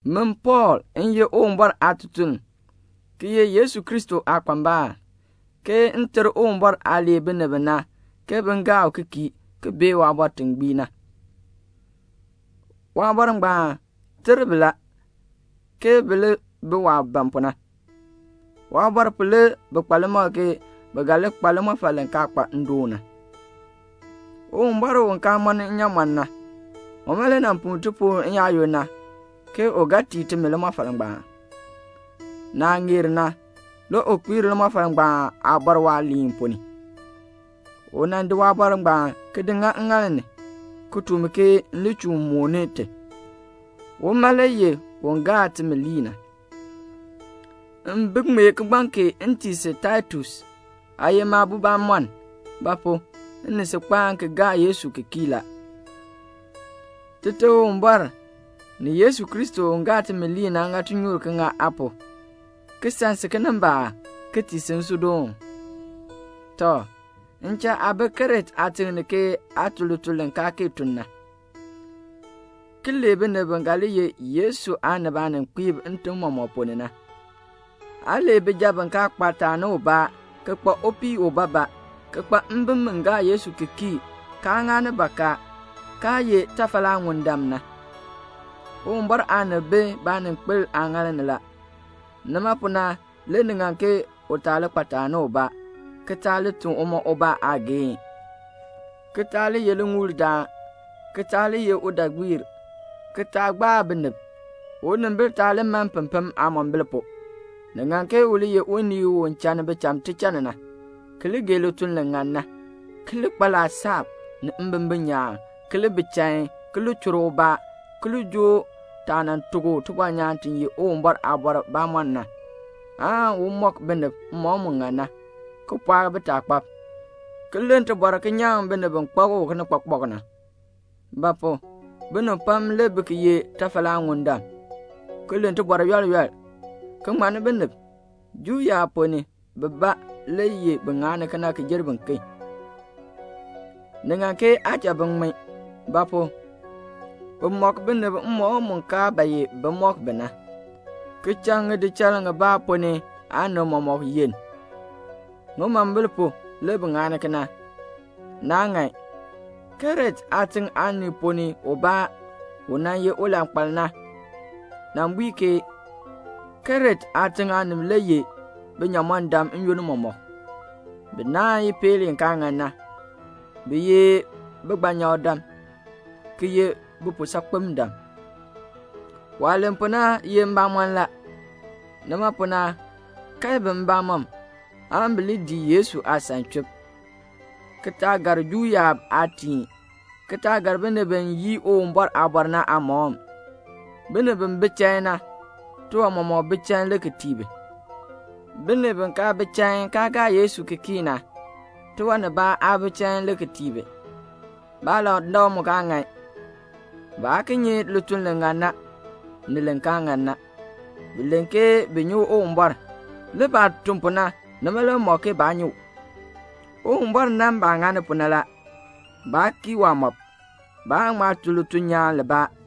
Min Pɔɔl, m ye Uwumbɔr aatutuln, ki ye Yesu Kristo aakpambal, ke m ter Uwumbɔr aah lee binib bi na ke bin gaa u ki kii ki bee waabɔr ti gbii na. Waabɔr ngbaan ter bi la, ke bi li bi waah ban pu na. Waabɔr pu le bi kpa limakl ke bi ga li kpa limɔfal li kaa kpa ndoon na. Uwumbɔr u kaa mɔni inyaamɔn na, uma le nan puu tipuul n-yaayoonn na, ke u ga tii timi limɔfal ngbaan. Naah ŋeer na le u kpiir limɔfal ngbaan aabɔr waaliin ponn ni. U di waaliin ngbaan, ki di ŋa ŋŋaal ni, ki tuk mi ke m li chuun mooni i. Uma le ye timi Aaŋmaŋmardaan. M bi ŋmee kigbaŋ kee m tii si Taitus. Aa ye maabo bamɔnn; ba pu? m ni si kpaani ki gaar Yesu ki kii la. Tite Uwumbɔr ni Yesu Kristo u ye timi Aaŋmaŋmardaan na ŋa tinyoor ki ŋa aa pu, [ki san si kinimbaak,] ki tii si nsuudoon. Tɔ, m cha aa bee Krete aatiŋ ni ke aa tun lituln li kaa kee tun na, ki lee binib bi ga li ye Yesu aanib aaninkpiib ntim mɔmɔk ponn ni na. Aa lee bijab bi kaa kpa taani ubaa, ki kpa upii ubaabaa, ki kpa mbim bi gaa Yesu ki kii, kaa ŋani bakaa, kaa ye tafalaaŋundam na. Uwumbɔr aanib bi baaninkpil aaŋaal ni la, nima pu na le ni ŋan ke u taa li kpa taani ubaa, ki taa li tun uma ubaa aageehn, ki taa li ye liŋuuldaan, ki taa li ye udaagbiir, ki taa gbaa binib; unimbil taa li man pempem aamombil pu. Ni ŋan ke u li ye unii u channi bicham tichann na, ki li gee lituln li ŋan na, ki li kpa laasab, ni mbimbin nyaan, ki li bi chain, ki li chur ubaa, ki li joo taah nan tuk u tibɔnyaan ti ye Uwumbɔr aabɔr bamɔnn na, aan u mɔk binib mmɔkm mu ŋan na, ki pɔɔk bitaakpab, ki len tibɔr ki nyaŋ binib bi kpak u kinikpakpak na. Ba pu? binib pam le bi ki ye tafalaaŋundam, ki len tibɔr yool yool, ki ŋmanni binib. Juu yaab ponn ni bibaa le ŋani kena ki jer biken. Ni ŋan ke aa cha bin ŋmin; ba pu? bi mɔk binib mmɔkm mu kaa ba ye bi mɔk bi na, ki cha ŋidichal ŋibaa ponn ni aanib mɔmɔk yenn. Ŋimombil pu, le bi ŋani kena. Naa ŋan. Krete aatiŋ aanib ponn ni ubaa, u nan ye ulankpal na, nan bui ke, "Krete aatiŋ aanib le ye binyamɔndam n-yoonn mɔmɔk. Bi naahn ipeel i kaa ŋan na. Bi ye bigbanyakdam, ki ye bipuusaakpendam." Waah len pu na ye mbamɔn la. Nima pu na, kae bi mbamɔm, aan bi li dii Yesu aasan chub, ki taa gar Juu yaab aatiin, ki taa gar binib bi yii Uwumbɔr aabɔr na aamɔkm. Binib bi bi chain na, tiwan mɔmɔk bi chain le ki tii bi. Binib bi kaa bi chain, kaa gaa Yesu ki kii na, tiwan nibaa aa bi chain le ki tii bi. Baalandak mu aa ŋan. Baa ki nyi lituln li ŋan na, ni li kaa ŋan na. Bi len ke bi nyi Uwumbɔr, le baah tun pu na, nima le mɔk ke baa nyi u. Uwumbɔr nan baah ŋani pu na la. Baa kii waamɔb. Baa ŋma tun lituln nyaan libaa.